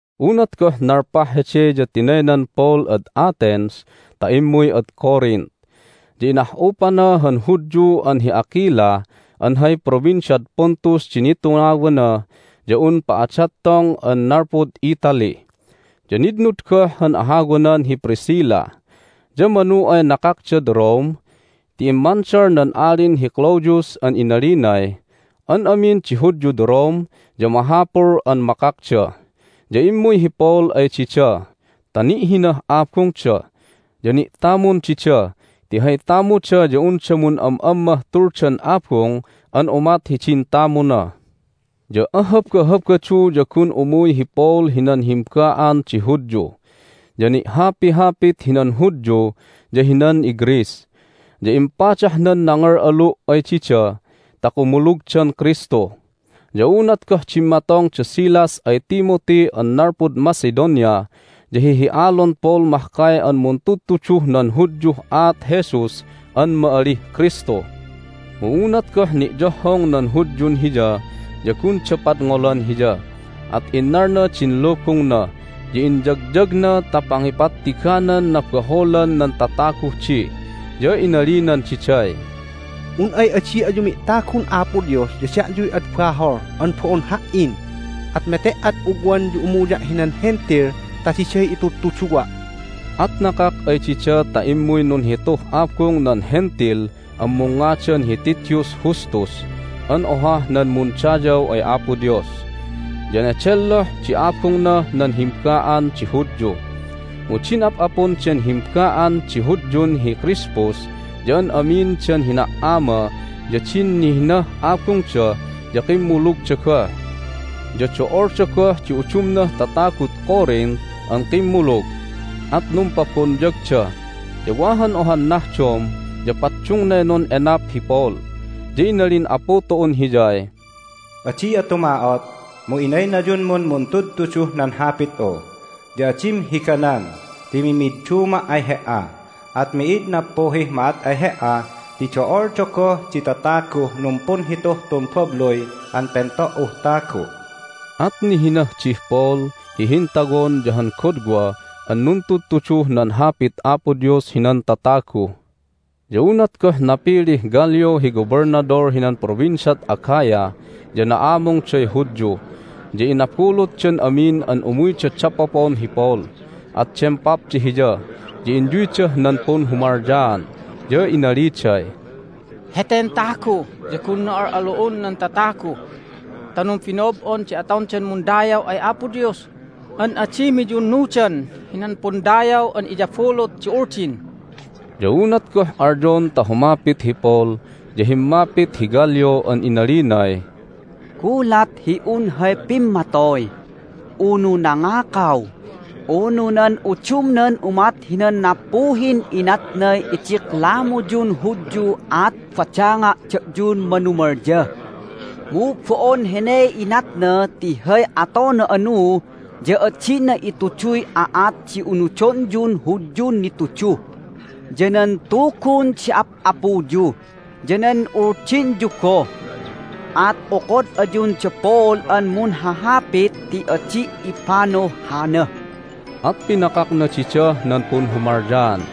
Unat goh nalpah hede ya tinaynan Paul ad Athens ta immuy ad Corinth. Ya inah'upana han Hudyu an hi Aquila an hay Provinciad Pontus di nitungawana ya un pa'adattong an nalpud Italy, ya nitnud goh han ahawanan hi Priscilla. Ya manu ay nakakdad Rome ti immandal nan Alin hi Claudius an inalinay, "An amin di Hudyud Rome ya mahapul an makakda." Ya immuy hi Paul ay dida ta ni'hinah abungda, ya ni'tamun dida ti hay tamuda ya unda mun'am'ammah tuldan abung an umat hidin tamuna. Ya aHabahabadu ya gun umuy hi Paul hinan himba'an di Hudyu, ya ni'hapihapit hinan Hudyu ya hinan iGreece, ya impadahnan nangal'alu' ay dida ta kumulugdan Kristu. Ya unat goh dimmatong da Silas ay Timothy an nalpud Macedonia ya hihi'alon Paul mahkay an muntudtuduh nan Hudyuh aat Jesus an ma'alih Kristu. Mu unat goh ni'yohhong nan Hudyun hiya ya gunda padngolan hiya, at innalna din lubungna, ya inyagyagna ta pangipattiganan nabaholan nan tataguh di. Ya inalinan diday, "Un ay adi ayu mi'tagun Apo Dios ya da'yuy ad bahol an bo'on ha"in! At mete"ad ugwan ya umuya' hinan Hentil ta diday itudtuduwa'!" At nakak ay dida ta immuy nunhituh abung nan Hentil an mungngadan hi Titius Justus an ohah nan mundayaw ay Apo Dios, ya nedelloh di abungnah nan himba'an di Hudyu. Mu din ap'apun den himba'an di Hudyun hi Crispus ya an amin dan hina"ama ya din nihinah abungda ya kimmulugda goh. Ya do'olda goh di udumnah tatagud Corinth an kimmulug, at numpabonyagda. Ya wa han ohan nahdom ya paddungnay nun'enap hi Paul, ya inalin Apu tu'un hiyay, "Adi'a tuma'ot, mu inaynayunmun muntudtuduh nan Hapit'u, ya adim higanan ti mimidduma' ay he"a, at mi'id nappuhih ma'at ay he"a ti do'olda goh di tataguh numpunhituh tun babluy an pento"uh tagu'." At nihinah dih Paul hi hintawon ya han godwa an nuntudtuduh nan Hapit Apo Dios hinan tatagu. Ya unat goh napilih Gallio hi gobelnadol hinan Provinciad Achaia ya na'amungday Hudyu, ya inabulutdan amin an umuyda dapopon hi Paul, at dempapda hiya, ya inyuydah nan punhumalyaan. Ya inaliday, "Heten tagu ya gunna al'alu'on nan tatagu ta numbino'ob'on di atondan mundayaw ay Apo Dios an adi miyunnudan hinan pundayaw an iyabulut di Uldin!" Ya unat goh alyon ta humapit hi Paul ya himmapit hi Gallio an inalinay, "Gulat hi un hay pimmatoy, unu nangakaw, unu nan udumnan umat hinan nappuhin inatnay idiklamuyun Hudyu at badanga' da'yun manumalya. Mu bo'on heney inatna ti hay atona anu ya adina ituduy aat di unudonyun Hudyun nitudu, ya nan Tugun di ap'apuyu, ya nan Uldinyu goh. At okod ayun da Paul an munhahapit ti adi' ipanuh hana!" At pinakakna didah nan punhumalyaan.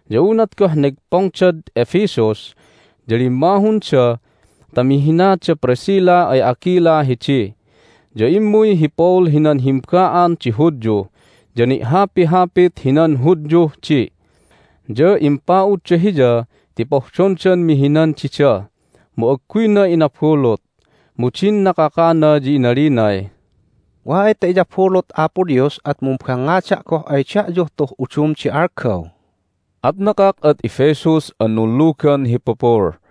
Ya unat goh negpongdad Ephesus ya limmahunda ta mihina da Priscilla ay Aquila hidi. Ya immuy hi Paul hinan himba'an di Hudyu, ya ni'hapihapit hinan Hudyuh di. Ya impa'udda hiya ti pohdondan mihinan dida, mu agguyna inabulut. Mu din nakakana ya inalinay, "Wa ay ta iyabulut Apo Dios at mumbangngada' goh ay da'yuh tuh udum di algaw." At nakak ad Ephesus an nunlugan hi pupul.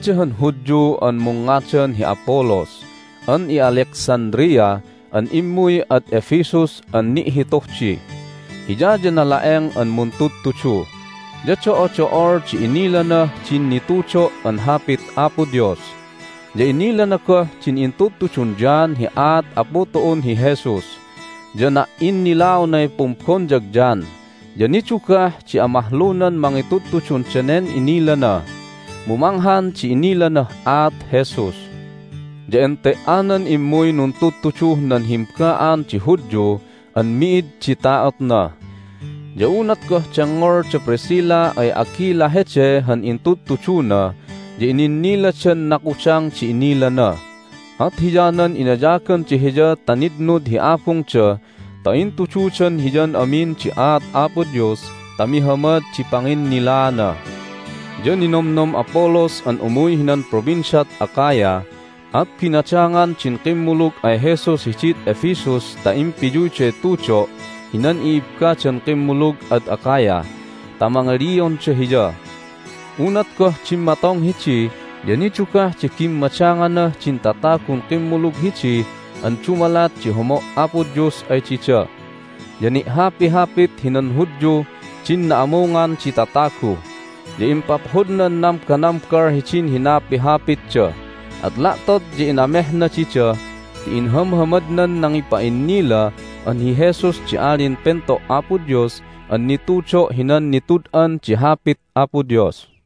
Wada han Hudyu an mungngadan hi Apollos an i'Alexandria an immuy ad Ephesus an ni'hituh di. Hiya ya nala'eng an muntudtudu, ya do'odo'ol di inilanah din nitudo' an Hapit Apo Dios. Ya inilana goh din intudtudun John hi aat Apu tu'un hi Jesus, ya na"innilaonay pumbonyag John. Ya nidugah di amahlunan mangitudtudun danen inilana, mu manghan di inilanah aat Jesus. Ya ente"anan immuy nuntudtuduh nan himba'an di Hudyu an mid di ta'otna. Ya unat goh dengngol da Priscilla ay Aquila hede han intudtuduna ya ininniladan nakudang di inilana, at hiyanan inayaganda hiya ta nitnud hi abungda ta intududan hiyan amin di aat Apo Dios ta mihamad di panginnilaana. Ya ninomnom Apollos an umuy hinan Provinciad Achaia, at binadangan din kimmulug ay Jesus hidid Ephesus ta impiyuyday tudo' hinan i'ibbadan kimmulug ad Achaia ta mangilionda hiya. Unat goh dimmatong hidi ya nidugah di bimmadanganah din tatagun kimmulug hidi an dumalat di homo' Apo Dios ay dida. Ya ni'hapihapit hinan Hudyuh din na'amungan di tatagu, ya impaphodnan nambanambal hidin hinapihapitda. At la'tot ya inamehna dida ti inhamhamadnan nangipa'innila an hi Jesus di Alin Pento' Apo Dios an nitudo' hinan nitud'an di Hapit Apo Dios.